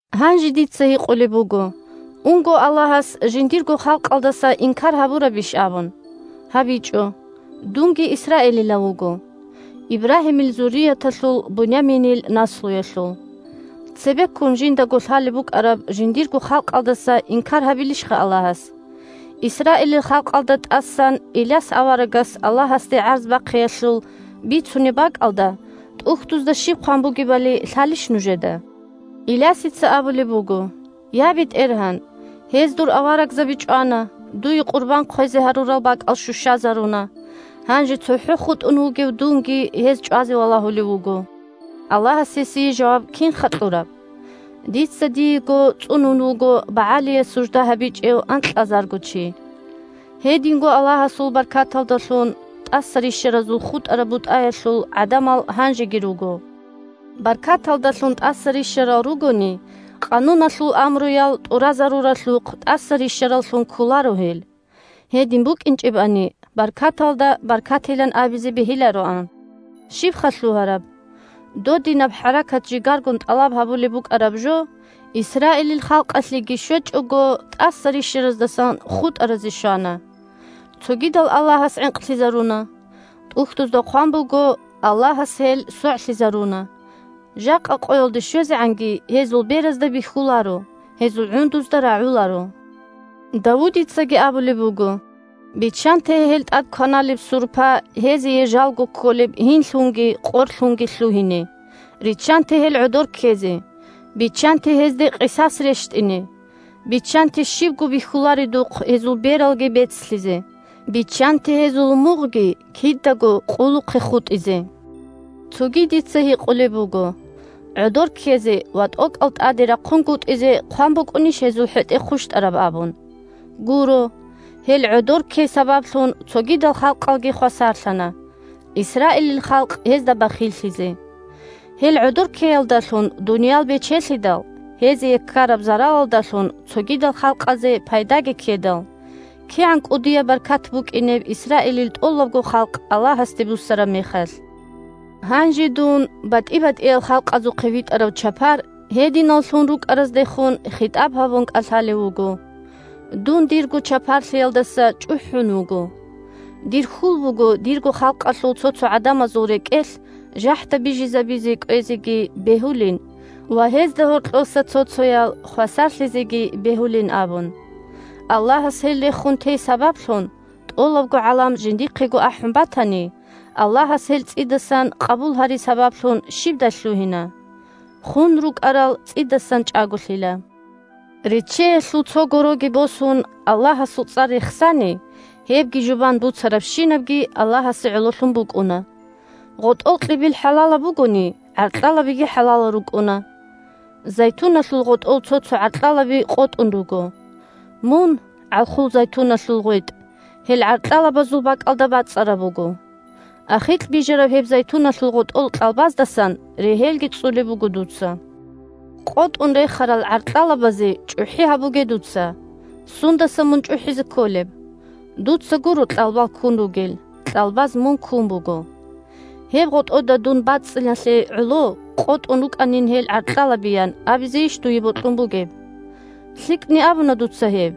Гьанже дица гьикъулеб буго: «Унго Аллагьас жиндирго халкъалдаса инкар гьабурабищ?» – абун. ГьабичӀо! Дунги исраилилав вуго, – Ибрагьимил зурияталъул, Буняминил наслуялъул. Цебеккун жиндаго лъалеб букӀараб жиндирго халкъалдаса инкар гьабилищха Аллагьас! Исраилил халкъалда тӀасан Иляс аварагас Аллагьасде гӀарз бахъиялъул бицунеб бакӀалда ТӀухьдузда щиб хъван бугебали лъалищ нужеда? Илясица абулеб буго: «Я БетӀергьан, гьез дур аварагзаби чӀвана, дуе къурбан хъвезе гьарурал бакӀал щущазаруна. Гьанже цохӀо хутӀун вугев дунги гьез чӀвазе валагьулев вуго!» Аллагьас гьесие жаваб кинха кьураб? «Дица диего цӀунун вуго БагӀалие БагӀал – мажусиязул гьересиаллагь. сужда гьабичӀев анкьазарго чи». Гьединго Аллагьасул баркаталдалъун тӀаса рищаразул хутӀараб бутӀаялъул гӀадамал гьанжеги руго. Баркаталдалъун тӀаса рищарал ругони, Къануналъул амруял тӀуразаруралъухъ тӀаса рищараллъун кколаро гьел. Гьедин букӀинчӀебани, баркаталда баркатилан абизе бегьилароан. Щибха лъугьараб? Додинаб хӀаракат-жигаргун тӀалаб гьабулеб букӀараб жо, Исраилил халкъалъеги щвечӀого, тӀаса рищараздасан хутӀаразе щвана. Цогидал Аллагьас гӀинкълъизаруна. ТӀухьдузда хъван буго: «Аллагьас гьел согӀлъизаруна. Жакъа къоялде щвезегӀанги гьезул беразда бихьуларо, гьезул гӀундузда рагӀуларо». Давудицаги абулеб буго: «Биччанте гьел тӀад кваналеб сурпа гьезие жалго кколеб гьинлъунги къорлъунги лъугьине, риччанте гьел гӀодор ккезе, биччанте гьезде къисас рещтӀине, биччанте щибго бихьуларедухъ гьезул бералги бецлъизе, биччанте гьезул мугъги кидаго къулухъе хутӀизе». Цоги дица гьикъулеб буго: «ГӀодор ккезе ва тӀокӀал тӀаде рахъунгутӀизе хъван букӀунищ гьезул хӀетӀе хъущтӀараб?» – абун. Гуро! Гьел гӀодор ккей сабаблъун цогидал халкъалги хвасарлъана, Исраилил халкъ гьезда бахиллъизе. Гьел гӀодор ккеялдалъун дуниял бечелъидал, гьезие ккараб заралалдалъун цогидал халкъазе пайдаги ккедал, кигӀан кӀудияб баркат букӀинеб Исраилил тӀолабго халкъ Аллагьасде буссараб мехалъ? Гьанже дун, батӀи-батӀиял халкъазухъе витӀарав чапар, гьединаллъун рукӀараздехун хитӀаб гьабун кӀалъалев вуго. Дун дирго чапарлъиялдаса чӀухӀун вуго! Дир хьул буго дирго халкъалъул цо-цо гӀадамазул рекӀелъ жахӀда бижизабизе кӀвезеги бегьулин ва гьезда гьоркьоса цо-цоял хвасарлъизеги бегьулин абун. Аллагьас гьел рехун тей сабаблъун тӀолабго гӀалам жиндихъего ахӀун батани, Аллагьас гьел цӀидасан къабул гьари сабаблъун щибдай лъугьина? Хун рукӀарал цӀидасан чӀаголъила! Реччеялъул цо гороги босун, Аллагьасул цӀар рехсани, гьебги жубан буцарабщинабги Аллагьасе гӀололъун букӀуна. ГъотӀол кьибил хӀалалаб бугони, гӀаркьалабиги хӀалалал рукӀуна. Зайтуналъул гъотӀол цо-цо гӀаркьалаби къотӀун руго. Мун – гӀалхул зайтуналъул гъветӀ, гьел гӀаркьалабазул бакӀалда бацӀцӀараб буго. Ахикь бижараб гьеб зайтуналъул гъотӀол кьалбаздасан регьелги цӀцӀулеб буго дуца. КъотӀун рехарал гӀаркьалабазе чӀухӀи гьабуге дуца. Сундаса мун чӀухӀизе кколеб? Дуца гуро кьалбал ккун ругел, кьалбаз мун ккун буго! «Гьеб гъотӀода дун бацӀцӀиналъе гӀоло къотӀун рукӀанин гьел гӀаркьалаби», – ян абизейищ дуе бокьун бугеб? ЛъикӀни абуна дуца гьеб!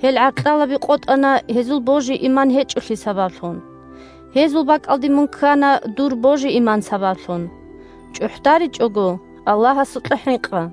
Гьел гӀаркьалаби къотӀана гьезул божи-иман гьечӀолъи сабаблъун. Гьезул бакӀалде мун ккана дур божи-иман сабаблъун. ЧӀухӀдаричӀого – Аллагьасукьа хӀинкъа!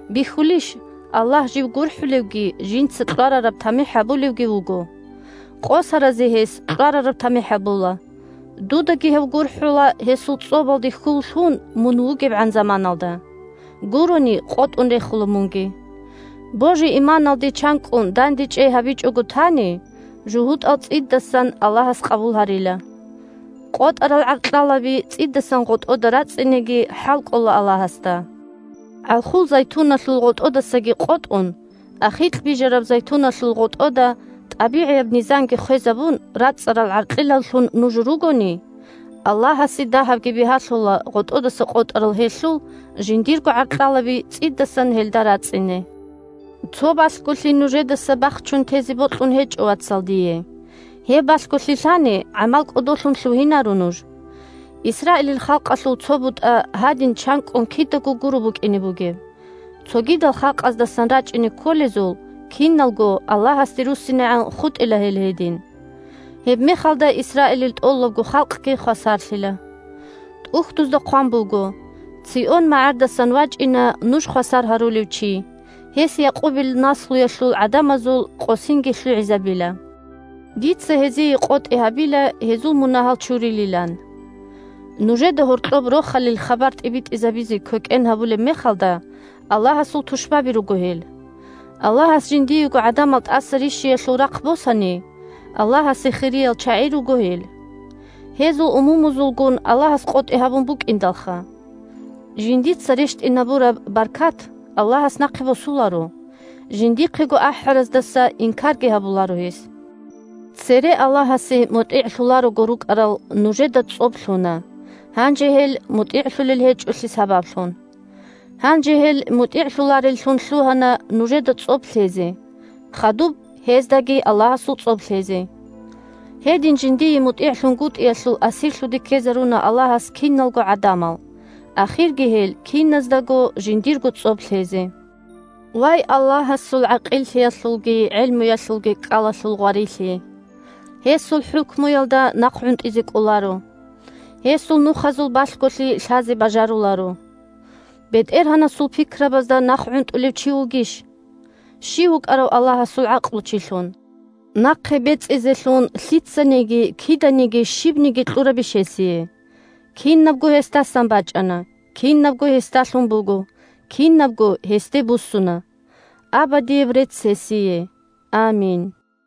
Бихьулищ, Аллагь жив гурхӀулевги, жинца кьварараб тамихӀ гьабулевги вуго! Къосаразе гьес кьварараб тамихӀ гьабула. Дудаги гьев гурхӀула гьесул цӀобалде хьул лъун мун вугебгӀан заманалда. Гурони – къотӀун рехула мунги! Божи-иманалде чанкӀкӀун дандечӀей гьабичӀого тани, жугьутӀал цӀидасан Аллагьас къабул гьарила. КъотӀарал гӀаркьалаби цӀидасан гъотӀода рацӀцӀинеги хӀалкӀола Аллагьасда. ГӀалхул зайтуналъул гъотӀодасаги къотӀун, ахикь бижараб зайтуналъул гъотӀода, тӀабигӀияб низамги хвезабун, рацӀцӀарал гӀаркьелаллъун нуж ругони, Аллагьасе дагьабги бигьалъула гъотӀодаса къотӀарал гьелъул жиндирго гӀаркьалаби цӀидасан гьелда рацӀцӀине. Цо балъголъи нужедаса бахчун тезе бокьун гьечӀо, вацал, дие. Гьеб балъголъи лъани, гӀамал кӀодолъун лъугьинаро нуж. Исраилил халкъалъул цо бутӀа гьадин чанкӀкӀун кидаго гуро букӀине бугеб, цогидал халкъаздасан рачӀине кколезул киналго Аллагьасде руссинегӀан хутӀила гьел гьедин. Гьебмехалда Исраилил тӀолабго халкъги хвасарлъила. ТӀухьдузда хъван буго: «Цион магӀардасан вачӀина нуж хвасар гьарулев чи, гьес Якъубил наслуялъул гӀадамазул къосинги лъугӀизабила. Дица гьезие къотӀи гьабила гьезул мунагьал чурилилан». Нужеда гьоркьоб Рохалил хабар тӀибитӀизабизе квекӀен гьабулеб мехалда, Аллагьасул тушбаби руго гьел. Аллагьас жиндиего гӀадамал тӀаса рищиялъул рахъ босани, – Аллагьасе хириял чагӀи руго гьел. Гьезул умумузулгун Аллагьас къотӀи гьабун букӀиндалха! Жиндица рещтӀинабураб баркат Аллагьас нахъе босуларо, жиндихъего ахӀараздаса инкарги гьабуларо гьес. Цере Аллагьасе мутӀигӀлъуларого рукӀарал нужеда цӀоб лъуна, – гьанже гьел мутӀигӀлъулел гьечӀолъи сабаблъун. Гьанже гьел мутӀигӀлъулареллъун лъугьана, – нужеда цӀоб лъезе, хадуб гьездаги Аллагьасул цӀоб лъезе. Гьедин жиндие мутӀигӀлъунгутӀиялъул асирлъуде ккезаруна Аллагьас киналго гӀадамал, ахирги гьел киназдаго жиндирго цӀоб лъезе. Вай, Аллагьасул гӀакъиллъиялъулги гӀелмуялъулги кӀкӀалалъул гъварилъи! Гьесул хӀукмуялда нахъгӀунтӀизе кӀоларо! Гьесул нухазул балъголъи лъазе бажаруларо! БетӀергьанасул пикрабазда нахъгӀунтӀулев чи вугищ? Щив вукӀарав Аллагьасул гӀакълучилъун? Нахъе бецӀизелъун лъицаниги киданиги щибниги кьурабищ гьесие? Кинабго гьесдасан бачӀана, кинабго гьесдалъун буго, кинабго гьесде буссуна! Абадияб рецц гьесие! Амин.